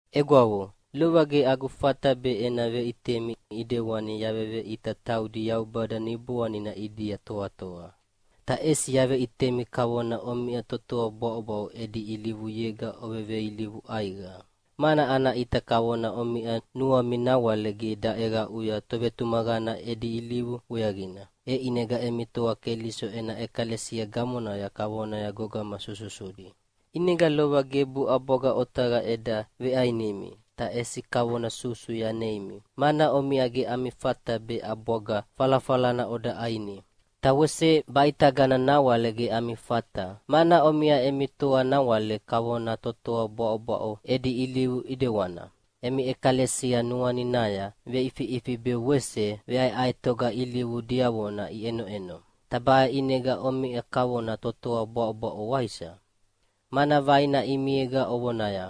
Egwavo, lova ge agu fata be ena veʼitemi ʼidewani yaveveʼita taudi Yaubada Niboanina ʼidia toatoa. Ta ʼesi yaveʼitemi kavona omiʼa totoa bwaʼobwaʼo edi ilivuyega oveveilivu ʼaiqa. Mana ana ʼita kavona omiʼa nuami nawale ge daʼeqaʼuya tovetumaqana edi ilivu weaqina, e ʼinega emi toa Keliso ena ʼekalesia gamonaya kavona gogama sususudi. ʼInega lova gebu ʼabwaga otaqa eda veʼainimi, ta ʼesi kavona susu yaneimi, mana omiʼa ge ami fata be ʼabwaga falafalana oda ʼaini. Ta wese baʼitagana nawale ge ami fata, mana omiʼa emi toa nawale kavona totoa bwaʼobwaʼo edi ilivu ʼidewana. Emi ʼekalesia nuaninaya veʼifiʼifi be wese veʼaeʼaetoga ilivu diavona iʼenoʼeno. Ta baʼe ʼinega omiʼa kavona totoa bwaʼobwaʼo, waisa? Mana vaina ʼimiega ovonaya,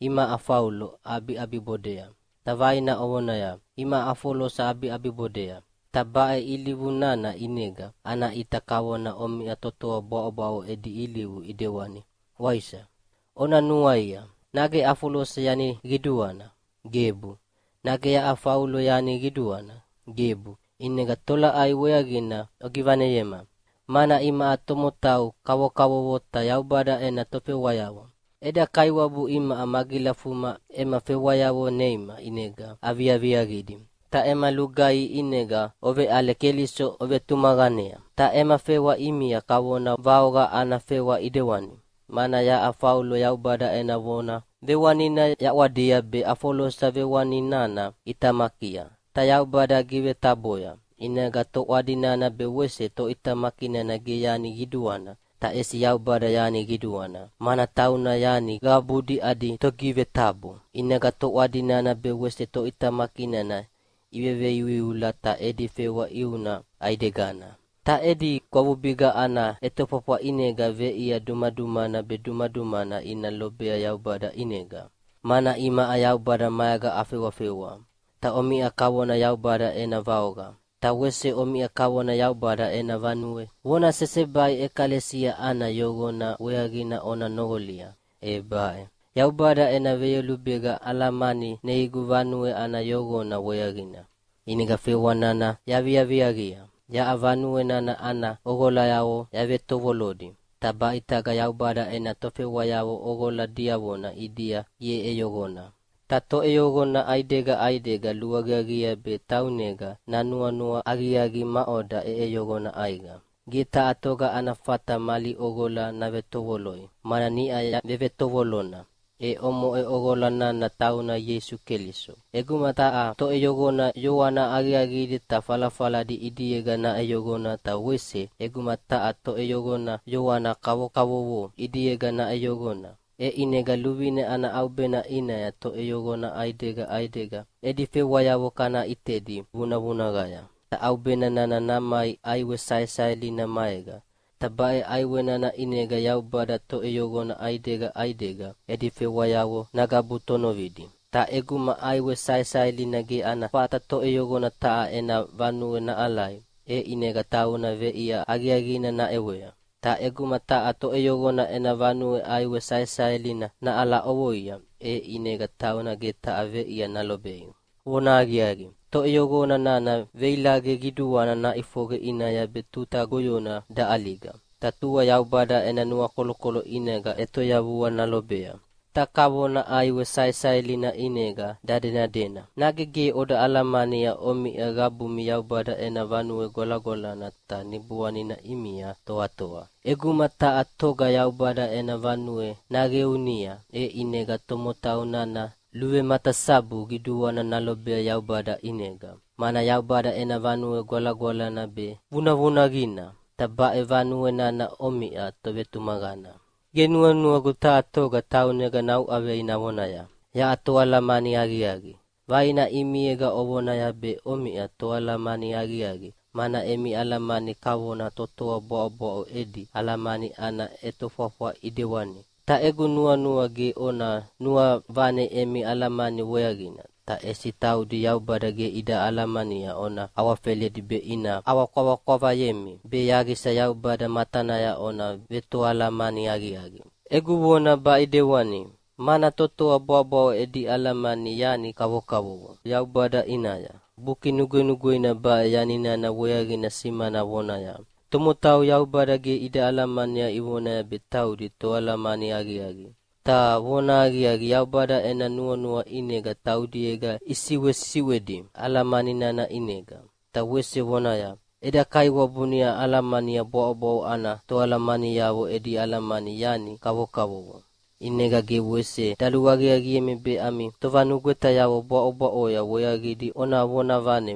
“Imaʼa Faulo aʼabiʼabibodea!” Ta vaina ovonaya, “Imaʼa Afolosa aʼabiʼabibodea!” Ta baʼe ilivu nana ʼinega, ana ʼita kavona omiʼa totoa bwaʼobwaʼo edi ilivu ʼidewani, waisa? Ona nuaia, nage Afolosa yani qiduana? Gebu! Nage yaʼa Faulo yani qiduana? Gebu! ʼInega tolaʼai weaqina ogivaneyema? Mana imaʼa tomotau kavokavovo ta Yaubada ena tofewayavo. Eda Kaiwabu imaʼa magilafuma ema fewayavo neima ʼinega aviaviaqidi. Ta ema lugaihi ʼinega oveʼale Keliso ovetumaqanea. Ta ema fewa ʼimia kavona vaoqa ana fewa ʼidewani, mana yaʼa Faulo Yaubada ena vona vewanina yaʼwadia be Afolosa vewani nana ʼitamakia, ta Yaubada givetaboya. ʼInega toʼwadi nana be wese toʼitamaki nana ge yani qiduana, ta ʼesi Yaubada yani qiduana, mana tauna yani qabudi adi togivetabo. ʼInega toʼwadi nana be wese toʼitamaki nana iveveiuiula ta edi fewa ʼiuna ʼaidegana. Ta edi gwavubiga ana ʼetofwafwa ʼinega veʼia dumadumana be dumadumana ina lobea Yaubada ʼinega. Mana imaʼa Yaubada maega afewafewa, ta omiʼa kavona Yaubada ena vaoqa. Ta wese omiʼa kavona Yaubada ena vanue. Vona sesebai ʼekalesia ana yoqona weaqina ona noqolia, e baʼe: Yaubada ena veyolubega alamani neigu vanue ana yoqona weaqina, ʼinega fewa nana yaviaviaqia. Yaʼa vanue nana ana ʼoqolayavo yavetovolodi, ta baʼitaga Yaubada ena tofewayavo ʼoqola diavona ʼidia iʼeʼeyoqona. Ta toʼeyoqona ʼaidega ʼaidega luaqiaqiea be taunega nanuanua aqiaqi maʼoda ʼeʼeyoqona ʼaiqa. Ge taha toga ana fata mali ʼoqola navetovoloi, mana niʼa vevetovolona, e omoʼe ʼoqola nana tauna Ieisu Keliso. ʼEguma taha toʼeyoqona yoana aqiaqidi ta falafaladi ʼidiega naʼeyoqona ta wese ʼeguma taha toʼeyoqona yoana kavokavovo ʼidiega naʼeyoqona, e ʼinega luvine ana ʼaubena ʼinaya toʼeyoqona ʼaidega ʼaidega edi fewayavo kana ʼitedi vunavunaqaya. Ta ʼaubena nana namai ʼaiwe saesaelina maega, ta baʼe ʼaiwe nana ʼinega Yaubada toʼeyoqona ʼaidega ʼaidega edi fewayavo nagabu tonovidi. Ta ʼeguma ʼaiwe saesaelina ge ana fata toʼeyoqona taha ena vanue naʼalai, e ʼinega tauna veʼia aqiaqina naʼewea. Ta ʼeguma taha toʼeyoqona ena vanue ʼaiwe saesaelina naʼala ʼovoia, e ʼinega tauna ge taha veʼia nalobei. Vonahaqiaqi, toʼeyoqona nana veilaqe qiduana naʼifoqe ʼinaya be tuta goyona daʼaliga, ta tua Yaubada ena nuakolokolo ʼinega ʼetoyavua nalobea, ta kavona ʼaiwe saesaelina ʼinega dadenadena. Nage ge oda oalamania omiʼa qabumi Yaubada ena vanue gwalagwalana ta Niboanina ʼimia toatoa? ʼEguma taha toga Yaubada ena vanue naqeunia, e ʼinega tomotau nana luvematasabu qiduana nalobea Yaubada ʼinega, mana Yaubada ena vanue gwalagwalana be vunavunaqina, ta baʼe vanue nana omiʼa tovetumaqana. Ge nuanuagu taha toga taunega nauʼavei navonaya, “Yaʼa toalamani aqiaqi!” Vaina ʼimiega ovonaya be omiʼa toalamani aqiaqi mana emi alamani kavona totoa bwaʼobwaʼo edi alamani ana ʼetofwafwa ʼidewani. Ta egu nuanua ge ona nuavane emi alamani weaqina, ta ʼesi taudi Yaubada ge ida alamania ona awafeledi be ina ʼawakwavakwavayemi, be yaqisa Yaubada matanaya ona vetoalamani aqiaqi. Egu vona baʼe ʼidewani, mana totoa bwaʼobwaʼo edi alamani yani kavokavovo Yaubada ʼinaya. Buki Nugwenugweina baʼe yani nana weaqina simana vonaya, “Tomotau Yaubada ge ida alamania ivonaya be taudi toalamani aqiaqi. Ta vonahaqiaqi, Yaubada ena nuanua ʼinega taudiega isiʼwesiʼwedi alamani nana ʼinega”, ta wese vonaya, “Eda Kaiwabu niʼa alamania bwaʼobwaʼo ana toalamaniavo edi alamani yani kavokavovo.” ʼInega ge wese daluaqiaqiemi be ami tovanugwetayavo bwaʼobwaʼoya weaqidi ona vonavane,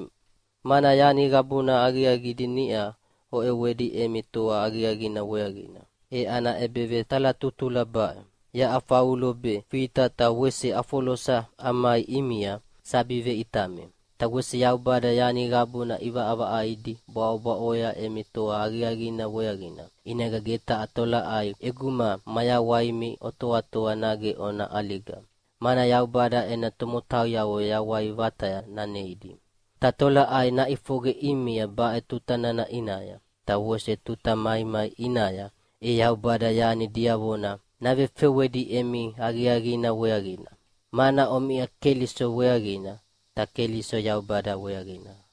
mana yani qabuna aqiaqidi niʼa oʼewedi emi toa aqiaqina weaqina. E ana ʼebevetalatutula baʼe: Yaʼa Faulo be, Fita ta wese Afolosa amai ʼimia sabi veʼitami. Ta wese Yaubada yani qabuna ʼivaʼavaʼaidi bwaʼobwaʼoya emi toa aqiaqina weaqina. ʼInega ge taha tolaʼai ʼeguma mayawaimi otoatoa, nage ona ʼaliga, mana Yaubada ena tomotauyavo yawai vataya naneidi. Ta tolaʼai naʼifoqe ʼimia baʼe tuta nana ʼinaya, ta wese tuta maimai ʼinaya, e Yaubada yani diavona navefewedi emi aqiaqina weaqina, mana omiʼa Keliso weaqina, ta Keliso Yaubada weaqina.